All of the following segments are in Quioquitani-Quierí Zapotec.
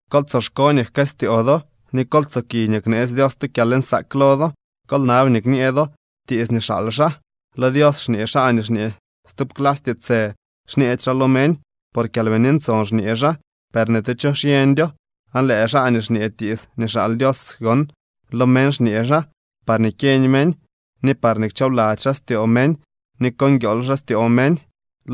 Kol tsoxko nii jkëstyoo do, ni kol tsoki nii kneetsy Dios tu kyalnsaak lo do. Kol nab nii kñee do tiits nii xaal xaa. Lo Dios xñee xaa nii xñee stub clasy tiitsë, xñeedy xaa lo meñ. Por Kyalbini Ntson xñee xaa, per ni tu cho xyeñdyo. Aan lëë xaa nii xñee tiits nii xaal Dios gon, lo meñ xñee xaa parñee kyeñ meñ, ni parñee kchoobladzy xaa styoo meñ ni ko nguiool xaa styoo meñ.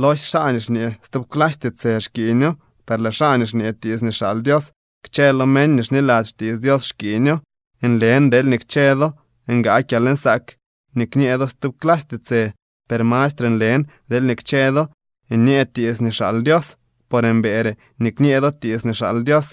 Losye xaa nii xñee stub clasy tiitsë xkiiñoo, per lëë xaa nii xñee tiits nii xaal Dios, kchë lo meñ nii xniladzy xtiits Dios xkiiño. Nlen deelñee kchë do ngaa kyalnsaak nii kñee do stub clasy tiitsë, per mastre nlen deelñee kchë do nyee tiits nii xaal Dios. Por mbëëre nii kñee do tiits nii xaal Dios,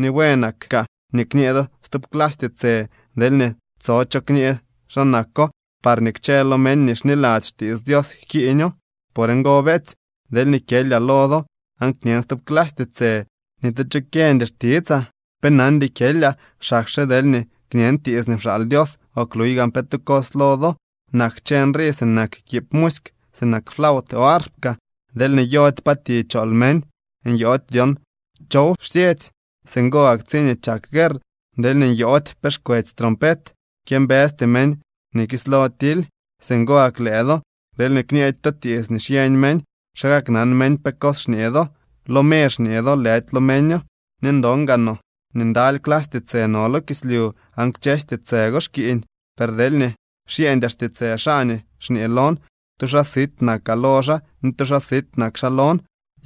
ni buenak kaa nii kñee do stub clasy tiitsë deelñee tso cho kñee xa nako parñee kchë lo meñ nii xniladzy xtiits Dios jkiiño. Por ngo, beetsy, deelñee kyelyaa lo do aan kñen stub clasy tiitsë, ni tu cho kyeñdy xtitsaa. Pe nandy kyelyaa, xakxe deelñee kñen tiits nii pxaal Dios o kluy gaan pe tu cos lo do. Nak kchë nrii sinak kiib musyk, sinak flaut o arp kaa. Deelñee nyoody pa ti chool meñ, nyoody dyon chow xsyetsy. Singo gak tsiñee chak guerr, deelñee nyoody pe xkwetsy trompet, kyëmbësty meñ nii kislo tily. Singo gak lëë do deelñee kñeedy to tiits nii xyeñ meñ, ¿xa kaknan meñ pe cos xñee do? ¡Lo me xñee do, lëdy lo meño! Ni ndon gaa no nii ndaly clasy tiitsë no lo kislyu, aan kchësy tiitsë go xkiiñ. Per deelñee xyeñdyaa xtiitsë xaa nii xñee lon, tu xaa sit nakaa lo xaa ni tu xaa sit nak xaa lon.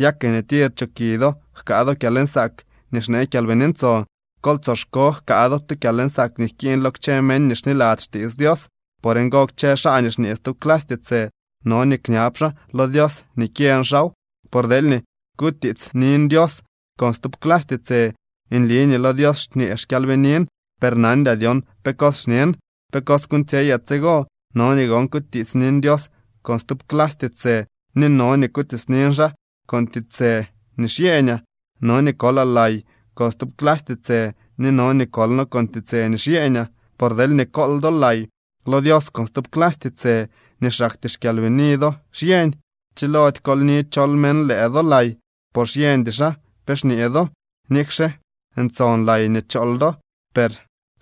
Ya ke nii tir choki do jkaa do kyalnsaak nii xnee Kyalbini Ntson, kol tsoxko jkaa do tu kyalnsaak nii jkiiñ lo kchë meñ nii xniladzy xtiits Dios. Por ngo, kchë xaa nii xñee stub clasy tiitsë no nii kñab xaa lo Dios nii kyeñ xaaw. Por deelñee kutiitsnin Dios con stub clasy tiitsë, nli nii lo Dios xñee xkyalbinin, per nandyaa dyon pe cos xñen. ¿Pe cos kuuñtsyeyaa tsigo? No nii gon kutiitsnin Dios con stub clasy tiitsë ni no nii kutiitsnin xaa con tiitsë nii xyeeñaa. No nii kolaa lay con stub clasy tiitsë ni no nii kolno con tiitsë nii xyeeñaa. Por deelñee kool do lay lo Dios con stub clasy tiitsë nii xaktyee xkyalbini do xyeñ, chilody koolni chol meñ lëë do lay, por xyeñdy xaa pe xñee do. Nikxe ntson lay nii chool do, per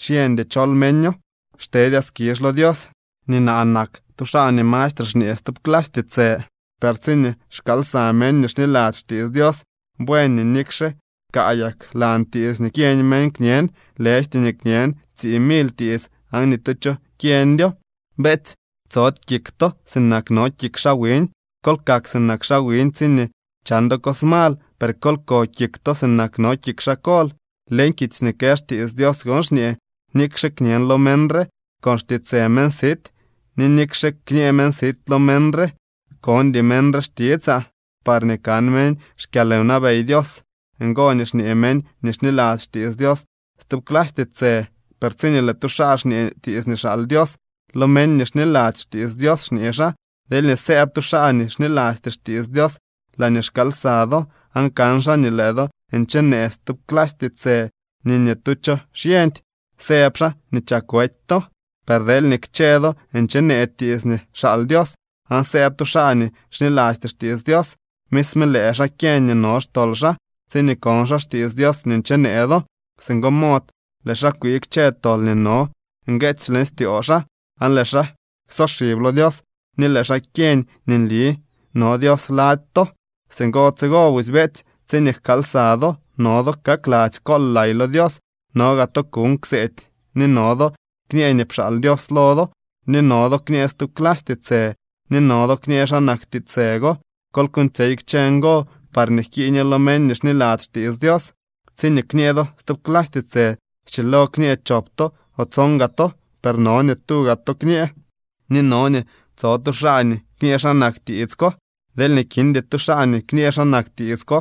xyeñdy chol meño. Xtedyaa skizh lo Dios nii naa nak tu xaa nii mastre xñee stub clasy tiitsë. Per tsiñee xkaal lsa meñ nii xniladzy xtiits Dios, buen nii nikxe kaayak lan tiits nii kyeñ meñ kñen, lëjty nii kñen tsii mily tiits aan ni tu cho kyeñdyo. Beetsy, tsody kik to sinak no kik xaa wiñ. Kol kak sinak xaa wiñ tsiñee chan do cos mal, per kol ko kik to sinak no kik xaa kol. Leñ kitsy nii kë xtiits Dios gon xñee: “Nikxe kñen lo meñ re con xtiitsë meñ sit, ni nikxe kñee meñ sit lo meñ re, kondy meñ re xtitsaa.” Parñee kan meñ xkyalwnabey Dios ngo nii xñee meñ nii xniladzy xtiits Dios stub clasy tiitsë, per tsiñee lëë tu xaa xñee tiits nii xaal Dios, lo meñ nii xniladzy xtiits Dios xñee xaa. Deelñee sëëb tu xaa nii xnilasty xtiits Dios laañee xkaal lsa do, aan kan xaa nii lëë do nchenee stub clasy tiitsë nii ni tu cho xyeñdy, sëb xaa nii chak wety to. Per deelñee kchë do nchenee tiits nii xaal Dios, aan sëëb tu xaa nii xnilasty xtiits Dios, misme lëë xaa kyeñ nii no xtol xaa tsiñee kon xaa xtiits Dios nii nchenee do. Singo mod lëë xaa kwii kchë tol nii no ngueetsy leñ styoo xaa, aan lëë xaa ksoxib lo Dios ni lëë xaa kyeñ nii nli no Dios lady to. Singo tsigo busy, beetsy, tsiñee jkaal lsa do, no do kakladzy kool lay lo Dios, no gaa to kuuñ kseedy ni no do kñee nii pxaal Dios lo do, ni no do kñee stub clasy tiitsë, ni no do kñee xa nak tiitsë go. Kol kuuñtsyey kchë ngo parñee jkiiño lo meñ nii xniladzy xtiits Dios. Tsiñee kñee do stub clasy tiitsë, schilo kñee chop to o tson gaa to, per no nii tuga to kñee, ni no nii tso tu xaa nii kñee xa nak tiits ko. Deelñee kindy tu xaa nii kñee xa nak tiits ko,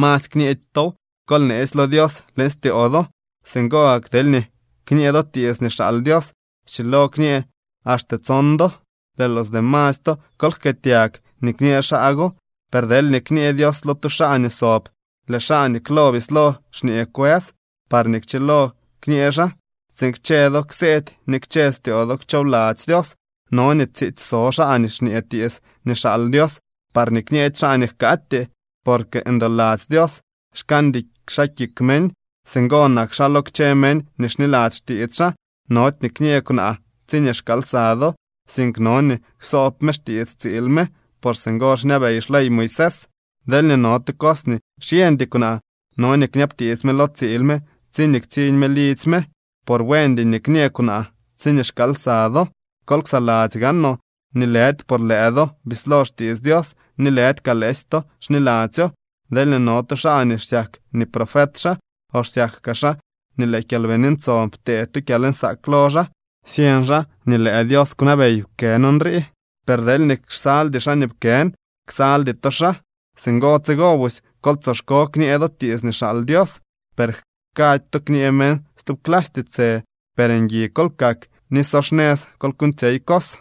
masy kñeedy tow, kol neesy lo Dios leñ styoo do. Singo gak deelñee kñee do tiits nii xaal Dios, schilo kñee axte tson do. Lëë los demasy to, kol jkëëtyag nii kñee xaa go. Per deelñee kñee Dios lo tu xaa nii sob, lëë xaa nii klo bislo xñee kwës parñee kchilo kñee xaa, tsiin kchë do kseedy ni kchë styoo do kchoobladzy Dios. No nii tsiitsy so xaa nii xñee tiits nii xaal Dios, parñee kñeedy xaa nii jkaatyee. Porque ndoladzy Dios, xkaandy xaa kik meñ. Singo nak xaa lo kchë meñ nii xniladzy xtiits xaa. Nody nii kñee kwnaa tsiñee xkaal lsa do, sink no nii ksoob me xtiits tsiil me, por singo xñabey xley Moisés. Deelñee no tu cos nii xyeñdy kwnaa, no nii kñabtiits me lo tsiil me tsiñee ktsiñ me lidzy me, por buendy nii kñee kwnaa tsiñee xkaal lsa do. Kol ksaladzy kaa noo nii lëdy por lëë do bislo xtiits Dios, ni lëdy kaa lëësy to xniladzyo. Deelñee no tu xaa nii xsyak nii profet xaa, o xsyak kaa xaa nii lëë Kyalbini Ntson ptee tu kyalnsaak lo xaa, syeñ xaa nii lëë Dios kwnabey pkën nrii. Per deelñee xsaldy xaa nii pkën, ksaldy to xaa. Singo tsigo busy, kol tsoxko kñee do tiits nii xaal Dios, per jkady to kñee meñ stub clasy tiitsë. Per ngui kol kak ni so xnëz kol kuuñtsyey cos.